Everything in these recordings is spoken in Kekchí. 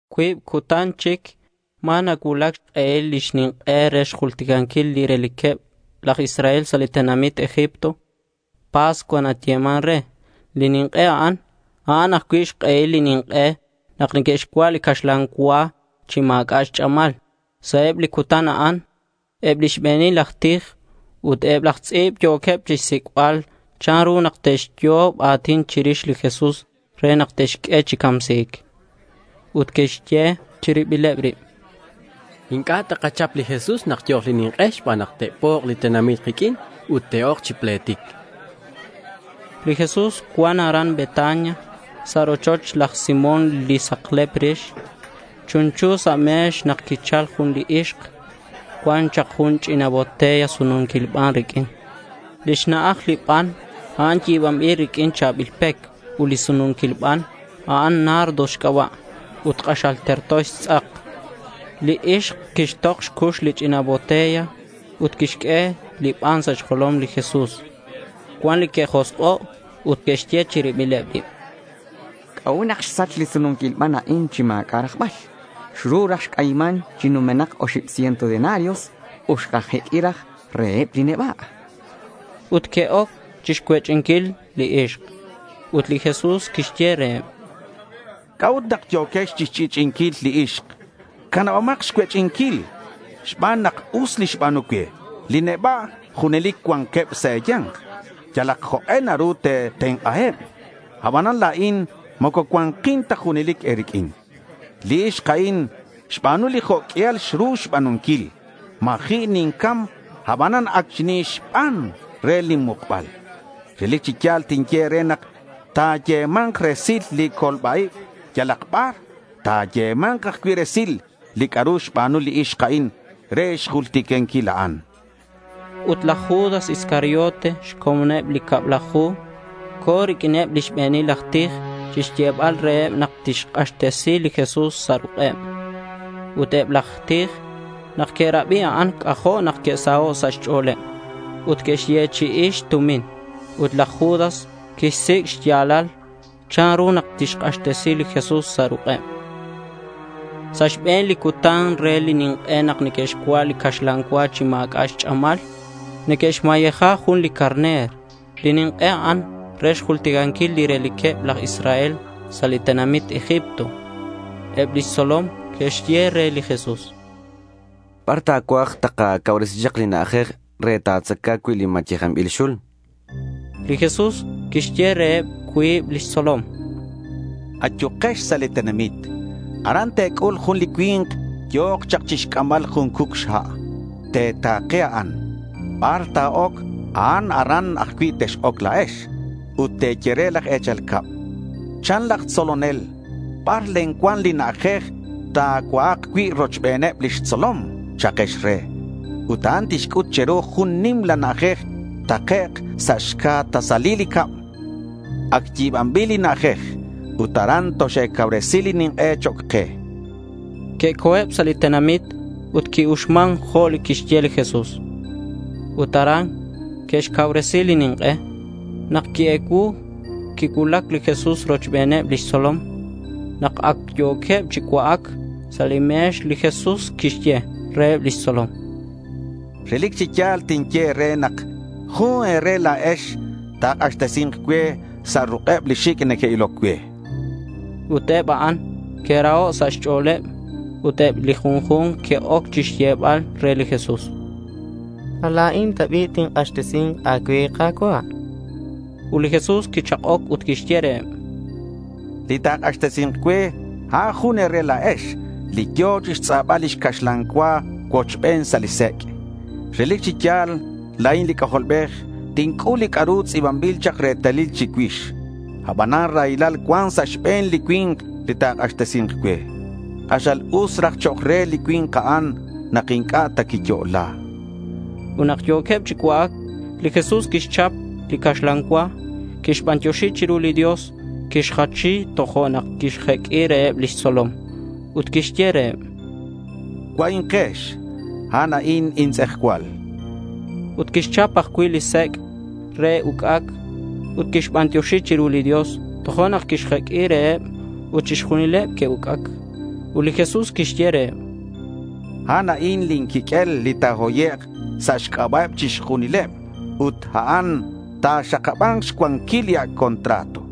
Cuib cutan chic ma̱ nacuulac xk'ehil li nink'e re xjulticanquil li reliqueb laj Israel sa' li tenamit Egipto. Pascua nayeman re li nink'e a'an. A'an ajcui' xk'ehil li nink'e nak neque'xcua' li caxlan cua chi ma̱c'a' xch'amal. Sa' eb li cutan a'an eb lix be̱nil aj tij ut eb laj tz'i̱b yo̱queb chixsic'bal chanru nak te'xyo'ob a̱tin chirix li Jesús re nak te'xq'ue chi camsi̱c. Ut que'xye chi ribileb rib: —Inc'a' takachap li Jesús nak yo̱k li nink'e xban nak te'pok' li tenamit kiq'uin ut te'oc chi pletic, chanqueb. Li Jesús cuan aran Betania sa' rochoch laj Simón li saklep rix. Chunchu sa' me̱x nak quichal jun li ixk. Cuan chak jun ch'ina botella sununquil ban riq'uin. Lix na'aj li ban a'an yi̱banbil riq'uin cha̱bil pec alabastro xc'aba' ut li sununquil ban a'an nardo xc'aba' ut k'axal terto xtz'ak. Li ixk quixtok xcux li ch'ina botella ut quixq'ue li ban sa' xjolom li Jesús. Cuan li que'josk'o' ut que'xye chi ribileb rib: —¿C'a'ut nak xsach li sununquil ban a'an chi ma̱c'a' rajbal? Xru raj xc'ayiman chi numenak oxib ciento denarios (Q150) ut xkajeq'ui raj reheb li neba', chanqueb. Ut que'oc chixcuech'inquil li ixk. Ut li Jesús quixye reheb: —¿C'a'ut nak yo̱quex chixch'i'ch'i'inquil li ixk? Canabomak xcuech'inquil xban nak us li xba̱nu cue. Li neba' junelic cuanqueb sa' e̱ya̱nk. Yalak jok'e naru te̱tenk'aheb. Abanan la̱in moco cua̱nkin ta junelic e̱riq'uin. Li ixk a'in xba̱nu li jo' q'uial xru xba̱nunquil. Ma̱ji' nincam abanan ac xinixban re lin mukbal. Relic chi ya̱l tinye e̱re nak ta̱yema̱nk resil li colba-ib yalak bar, ta̱yema̱nk ajcui' resil li c'a'ru xba̱nu li ixk a'in re xjulticanquil a'an, chan. Ut laj Judas Iscariote, xcomoneb li cablaju, co̱ riq'uineb lix be̱nil aj tij chixyebal reheb nak tixk'axtesi li Jesús sa' ruk'eb. Ut eb laj tij nak que'rabi a'an c'ajo' nak que'saho' sa' xch'o̱leb ut que'xyechi'i xtumin. Ut laj Judas quixsic' xya̱lal chanru nak tixk'axtesi li Jesús sa' ruk'eb. Sa' li xbe̱n cutan re li nink'e nak neque'xcua' li caxlan cua chi ma̱c'a' xch'amal, neque'xmayeja jun li carner. Li nink'e a'an re xjulticanquil li reliqueb laj Israel sa' li tenamit Egipto. Eb lix tzolom que'xye re li Jesús: —¿Bar ta̱cuaj takacauresi chak li na'ajej re ta̱tzaca cui' li mayejanbil xul? chanqueb. Li Jesús quixye reheb cuib lix tzolom: —Ayukex sa' li tenamit. Aran te̱c'ul jun li cui̱nk yo̱ chak chixc'ambal jun cuc xha'. Te̱ta̱ke a'an. Bar ta̱oc a'an aran ajcui' tex-oc la̱ex. Ut te̱ye re laj e̱chal cab, “Chan laj tzolonel, ¿bar len cuan li na'ajej ta̱cua'ak cui' rochbeneb lix tzolom?” cha'kex re. Ut a'an tixc'ut che̱ru jun nimla na'ajej takec' sa' xca' tasalil li cab. Ac yi̱banbil li na'ajej. Ut aran toxe̱cauresi li nink'e chok' ke, chan li Jesús. Que'co̱eb sa' li tenamit ut qui-uxman jo' quixye li Jesús. Ut aran que'xcauresi li nink'e. Nak qui-ecuu, quicuulac li Jesús rochbeneb lix tzolom. Nak ac yo̱queb chi cua'ac sa' li me̱x, li Jesús quixye reheb lix tzolom, —Relic chi ya̱l tinye e̱re nak jun e̱re la̱ex ta̱k'axtesi̱nk cue sa' ruk'eb li xic' neque'iloc cue, chan. Ut eb a'an que'raho' sa' xch'o̱leb ut eb li junju̱nk que'oc chixyebal re li Jesús: —¿Ma la̱in ta bi' tink'axtesi̱nk a̱cue, Ka̱cua'? chanqueb. Ut li Jesús quichak'oc ut quixye reheb: —Li ta̱k'axtesi̱nk cue, a'an jun e̱re la̱ex li yo̱ chixtz'abal lix caxlan cua cuochben sa' li sec'. Relic chi ya̱l la̱in li C'ajolbej tinc'ul li c'a'ru tz'i̱banbil chak retalil chicuix. Abanan raylal cuan sa' xbe̱n li cui̱nk li ta̱k'axtesi̱nk cue. K'axal us raj chok' re li cui̱nk a'an nak inc'a' ta quiyo'la.— Ut nak yo̱queb chi cua'ac, li Jesús quixchap li caxlan cua. Quixbantioxi chiru li Dios, quixjachi, tojo'nak quixjeq'ui reheb lix tzolom. Ut quixye reheb: —Cua'inkex. A'an a'in intz'ejcual.— Ut quixchap ajcui' li sec' re uc'ac ut quixbantioxi chiru li Dios, tojo'nak quixq'ue reheb ut chixjunileb que'uc'ac. Ut li Jesús quixye reheb: —A'an a'in lin quiq'uel li ta̱hoyek' sa' xc'aba'eb chixjunileb ut a'an ta̱xakaba̱nk xcuanquil li Ac' Contrato.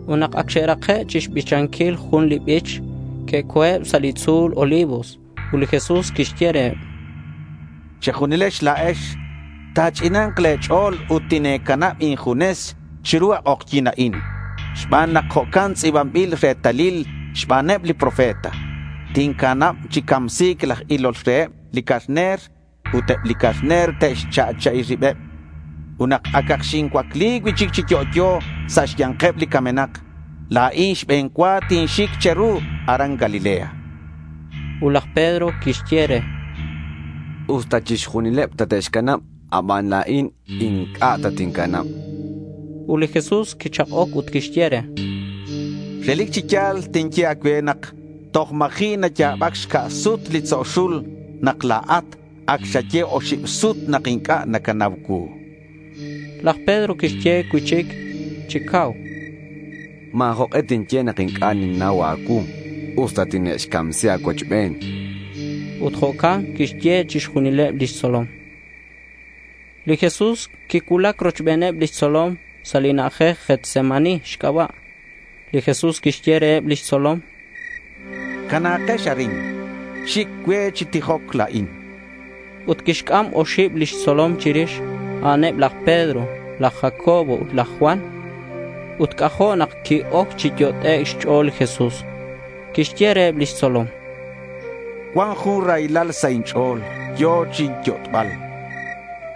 Ut nak ac xe'rake' xbichanquil jun li bich, que'co̱eb sa' li tzu̱l Olivos. Ut li Jesús quixye reheb: —Che̱junilex la̱ex ta̱ch'ina̱k le̱ ch'o̱l ut tine̱canab injunes chiru a k'ojyi̱n a'in xban nak jo'ca'in tz'i̱banbil retalil xbaneb li profeta: Tincanab chi camsi̱c laj ilol reheb li carner ut eb li carner te'xcha'cha'i ribeb. Ut nak acak xincuacli cui'chic chi yo'yo sa' xya̱nkeb li camenak, la̱in xbe̱n cua tinxic che̱ru aran Galilea.— Ut laj Pedro quixye re: —Usta chixjunileb tate'xcanab abanan la̱in inc'a' tatincanab.— Ut li Jesús quichak'oc ut quixye re: —Relic chi ya̱l tinye a̱cue nak toj ma̱ji' naya̱bac xca' sut li tzo' xul nak la̱at ac xaye oxib sut nak inc'a' nacanau cuu.— Ut laj Pedro quixye cui'chic chi cau: —Ma̱ jok'e tinye nak inc'a' ninnau a̱cuu usta tine'xcamsi a̱cuochben, chan. Ut jo'can que'xye chixjunileb lix tzolom. Li Jesús quicuulac rochbeneb lix tzolom sa' li na'ajej Getsemaní xc'aba'. Li Jesús quixye reheb lix tzolom: —Cana̱kex arin. Xic cue chi tijoc la̱in.— Ut quixc'am oxib lix tzolom chirix. A'aneb laj Pedro, laj Jacobo ut laj Juan. Ut c'ajo' nak qui-oc chi yot'ec' xch'o̱l li Jesús. Quixye reheb lix tzolom: —Cuan jun raylal sa' inch'o̱l yo̱ chinyot'bal.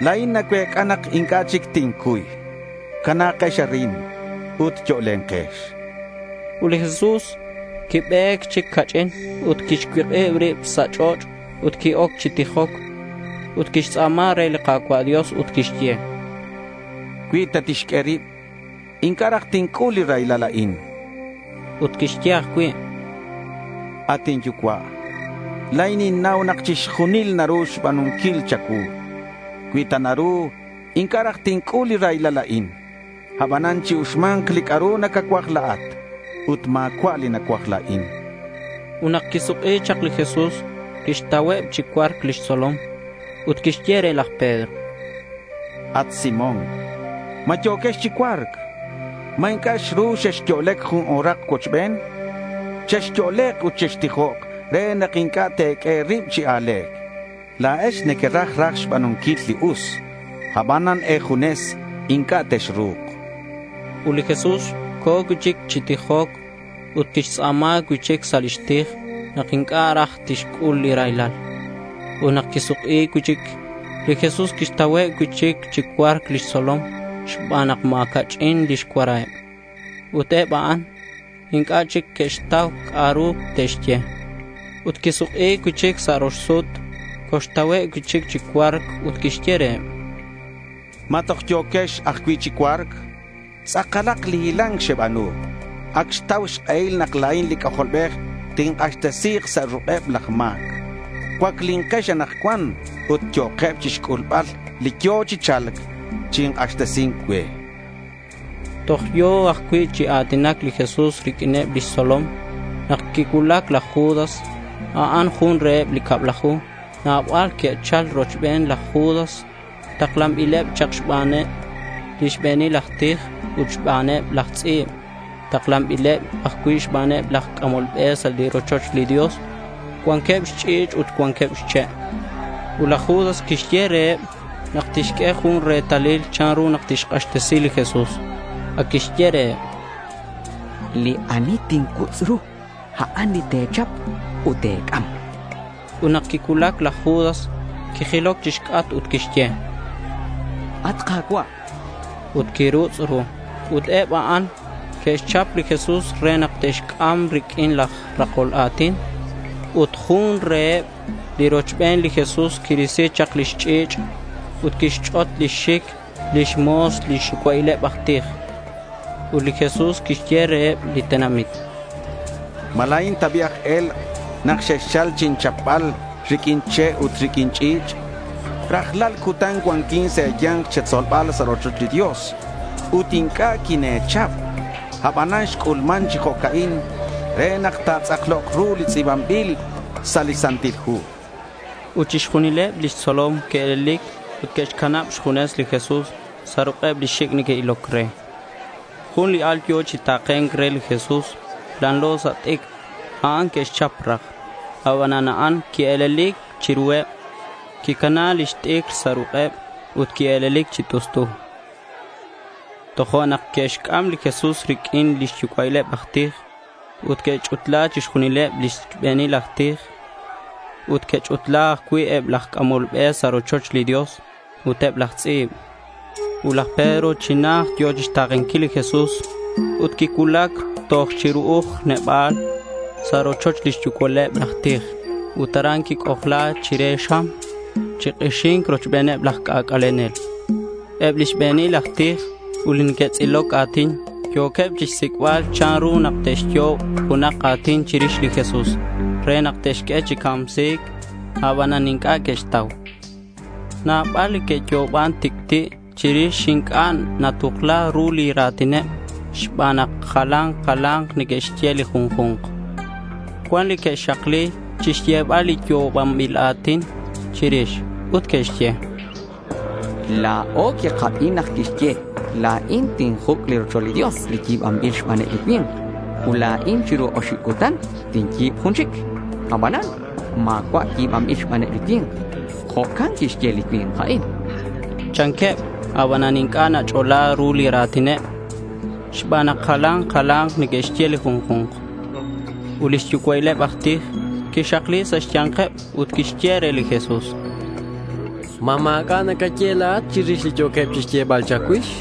La̱in nacuec'a nak inc'a' chic tincuy. Cana̱kex arin ut yo'lenkex.— Ut li Jesús quibe̱c chic ca'ch'in ut quixcuik'ib rib sa' ch'och' ut qui-oc chi tijoc ut quixtz'a̱ma re li Ka̱cua' Dios ut quixye: —Cui ta tixq'ue rib, inc'a' raj tinc'ul li raylal a'in.— Ut quixye ajcui': —At inYucua', la̱in ninnau nak chixjunil naru xba̱nunquil cha̱cuu. Cui ta naru inc'a' raj tinc'ul li raylal a'in. Abanan chi-uxma̱nk li c'a'ru nacacuaj la̱at ut ma̱cua' li nacuaj la̱in.— Ut nak quisuk'i chak li Jesús, quixtauheb chi cua̱rc lix tzolom. Ut quixye re laj Pedro: —At Simón, ¿ma yo̱quex chi cua̱rc? ¿Ma inc'a' xru xexyo'lec jun o̱rak cuochben? Chexyo'lek ut chextijok re nak inc'a' te̱q'ue e̱rib chi a̱le̱c. La̱ex nequeraj raj xba̱nunquil li us, abanan e̱junes inc'a' texru̱k.— Ut li Jesús co̱ cui'chic chi tijoc ut quixtz'a̱ma cui'chic sa' lix tij nak inc'a' raj tixc'ul li raylal. Ut nak quisuk'i cui'chic li Jesús quixtauheb cui'chic chi cua̱rc lix tzolom xban nak ma̱ ca'ch'in lix cuaraheb. Ut eb a'an inc'a' chic neque'xtau c'a'ru te'xye. Ut quisuk'i cui'chic sa' rox sut, coxtauheb cui'chic chi cua̱rc ut quixye reheb: —¿Ma toj yo̱quex ajcui' chi cua̱rc? Tz'akalak li hila̱nc xeba̱nu. Ac xtau xk'ehil nak la̱in li C'ajolbej tink'axtesi̱k sa' ruk'eb laj ma̱c. Cuaclinkex anakcuan, ut yo'keb chixc'ulbal li yo̱ chi cha̱lc chi k'axtesi̱nc cue, chan. Toj yo̱ ajcui' chi a̱tinac li Jesús riq'uineb lix tzolom nak quicuulac laj Judas. A'an jun reheb li cablaju. Nabal que'chal rochben laj Judas taklanbileb chak xbaneb li xbe̱nil aj tij ut xbaneb laj tz'i̱b. Taklanbileb ajcui' xbaneb laj c'amol be sa' li rochoch li Dios. Cuanqueb xch'i̱ch' ut cuanqueb xche'. Ut laj Judas quixye reheb nak tixq'ue jun retalil chanru nak tixk'axtesi li Jesús. Ac quixye reheb: —Li ani tincuutz' ru, a'an li te̱chap ut te̱c'am.— Ut nak quicuulac laj Judas quijiloc chixc'atk, ut quixye: —At Ka̱cua',— ut quirutz' ru. Ut eb a'an que'xchap li Jesús re nak te'xc'am riq'uin laj rakol a̱tin. Ut jun reheb li rochben li Jesús quirisi chak lix ch'i̱ch' ut quixch'ot lix xic lix mo̱s li xyucua'ileb aj tij. Ut li Jesús quixye reheb li tenamit: —¿Ma la̱in ta bi' aj e̱lk' nak xexchal chinchapbal riq'uin che' ut riq'uin ch'i̱ch'? Rajlal cutan cuanquin sa' e̱ya̱nk che̱tzolbal sa' rochoch li Dios ut inc'a' quine̱chap. Abanan xc'ulman chi jo'ca'in re nak ta̱tz'aklok ru li tz'i̱banbil sa' li Santil Hu,— chan li Jesús. Ut chixjunileb lix tzolom que'e̱lelic ut que'xcanab xjunes li Jesús sa' ruk'eb li xic' neque'iloc re. Jun li al yo̱ chi ta̱ke̱nc re li Jesús lanlo sa' xt'icr. A'an que'xchap raj. Abanan a'an quie̱lelic chiruheb. Quicana lix t'icr sa' ruk'eb ut quie̱lelic chi t'ust'u. Tojo'nak que'xc'am li Jesús riq'uin lix yucua'ileb aj tij ut que'ch'utla chixjunileb lix be̱nil aj tij. Ut que'ch'utla ajcui' eb laj c'amol be sa' rochoch li Dios ut eb laj tz'i̱b. Ut laj Pedro chi najt yo̱ chixta̱kenquil li Jesús ut quicuulac toj chi ru'uj neba̱l sa' rochoch lix yucua'il eb aj tij ut aran quic'ojla chire xam chi k'ixi̱nc rochbeneb laj c'ac'alenel. Eb li xbe̱nil aj tij ut li neque'tz'iloc a̱tin yo̱queb chixsic'bal chanru nak te'xyo'ob junak a̱tin chirix li Jesús re nak te'xq'ue chi camsi̱c. Abanan inc'a' que'xtau. Nabal li que'yo'oban tic'ti' chirix ut inc'a' natukla ru li ra̱tineb xban nak jalan jala̱nk neque'xye li junju̱nk. Cuan li que'xakli chixyebal li yo'obanbil a̱tin chirix. Ut que'xye: —La̱o quikabi nak quixye, “La̱in tinjuc' li rochoch li Dios li yi̱banbil xbaneb li cui̱nk, ut la̱in chiru oxib cutan tinyi̱b jun chic, aban ma̱cua' yi̱banbil xbaneb li cui̱nk.” Jo'can quixye li cui̱nk a'in, chanqueb. Abanan inc'a' nach'ola ru li ra̱tineb xban nak jalan jala̱nk neque'xye li junju̱nk. Ut li xyucua'ileb aj tij quixakli sa' xya̱nkeb ut quixye re li Jesús, —¿Ma ma̱c'a' nacaye la̱at chirix li yo̱queb chixyebal cha̱cuix?—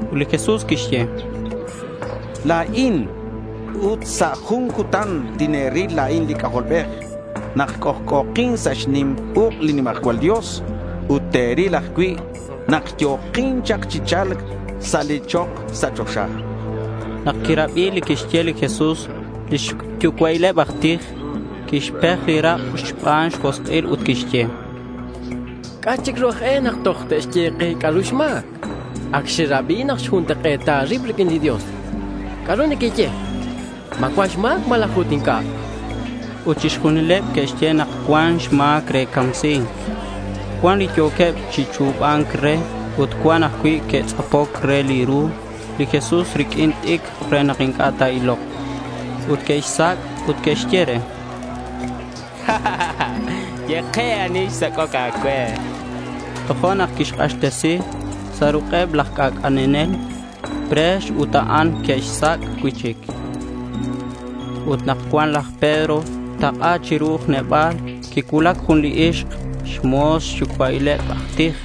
Ut li Jesús quixye: —La̱in. Ut sa' jun cutan tine̱ril la̱in li C'ajolbej nak c'ojc'o̱kin sa' xnim uk' li nimajcual Dios ut te̱ril ajcui' nak yo̱kin chak chi cha̱lc sa' li chok sa' choxa, chan. Nak quirabi li quixye li Jesús, li xyucua'il eb aj tij quixpej li rak' xban xjosk'il ut quixye: —¿C'a' chic ru aj e nak toj te'xye ke c'a'ru xma̱c? Ac xerabi nak xjuntak'e̱ta rib riq'uin li Dios. ¿C'a'ru nequeye? ¿Ma cuan xma̱c malaj ut inc'a'? chan. Ut chixjunileb que'xye nak cuan xma̱c re camsi̱c. Cuan li yo̱queb chi chu̱ba̱nc re ut cuan ajcui' que'tz'apoc re li ru li Jesús riq'uin t'icr re nak inc'a' ta̱ilok, ut que'xsac' ut que'xye re: —Ye ke ani xsac'oc a̱cue, chanqueb. Tojo'nak que'xk'axtesi sa' ruk'eb laj c'ac'alenel pre̱x ut eb a'an que'xsac' cui'chic. Ut nak cuan laj Pedro tak'a chi ru'uj neba̱l, quicuulac jun li ixk, xmo̱s li xyucua'il eb aj tij.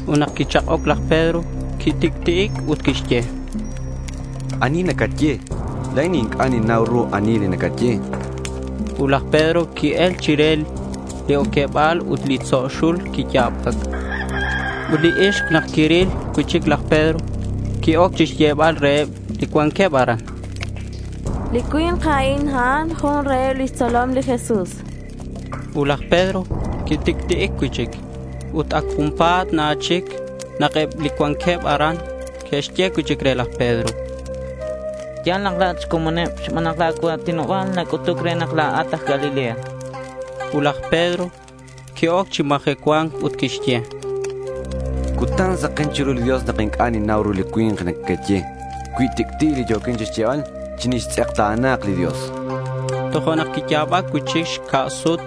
Ut nak quichak'oc laj Pedro, quitic'ti'ic ut quixye: —¿Ani nacaye? La̱in inc'a' ninnau ru ani li nacaye.— Ut laj Pedro qui-el chire li oqueba̱l ut li tzo' xul quiya̱bac. Ut li ixk nak quiril cui'chic laj Pedro, qui-oc chixyebal reheb li cuanqueb aran: —Li cui̱nk a'in, a'an jun reheb lix tzolom li Jesús, chan. Ut laj Pedro quitic'ti'ic cui'chic. Ut ac junpa̱t na chic nak eb li cuanqueb aran que'xye cui'chic re laj Pedro: —Ya̱l. La̱at xcomoneb xban nak la̱ cua̱tinoba̱l nac'utuc re nak la̱at aj Galilea.— Ut laj Pedro qui-oc chi majecua̱nc ut quixye: —Cutan saken chiru li Dios nak inc'a' ninnau ru li cui̱nk li nequeye. Cui tic'ti' li yo̱quin chixyebal, chinixtz'ekta̱na̱k li Dios, chan. Tojo'nak quiya̱bac cui'chic xca' sut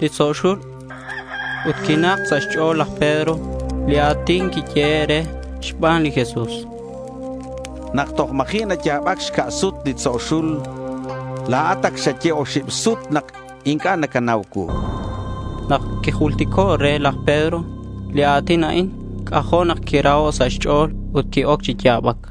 li tzo' xul. Ut quinak sa' xch'o̱l laj Pedro li a̱tin quiyehe' re xban li Jesús, “Nak toj ma̱ji' naya̱bac xca' sut li tzo' xul, la̱at ac xaye oxib sut nak inc'a' nacanau cuu”. Nak quijultico' re laj Pedro li a̱tin a'in, c'ajo' nak quiraho' sa' xch'o̱l ut qui-oc chi ya̱bac.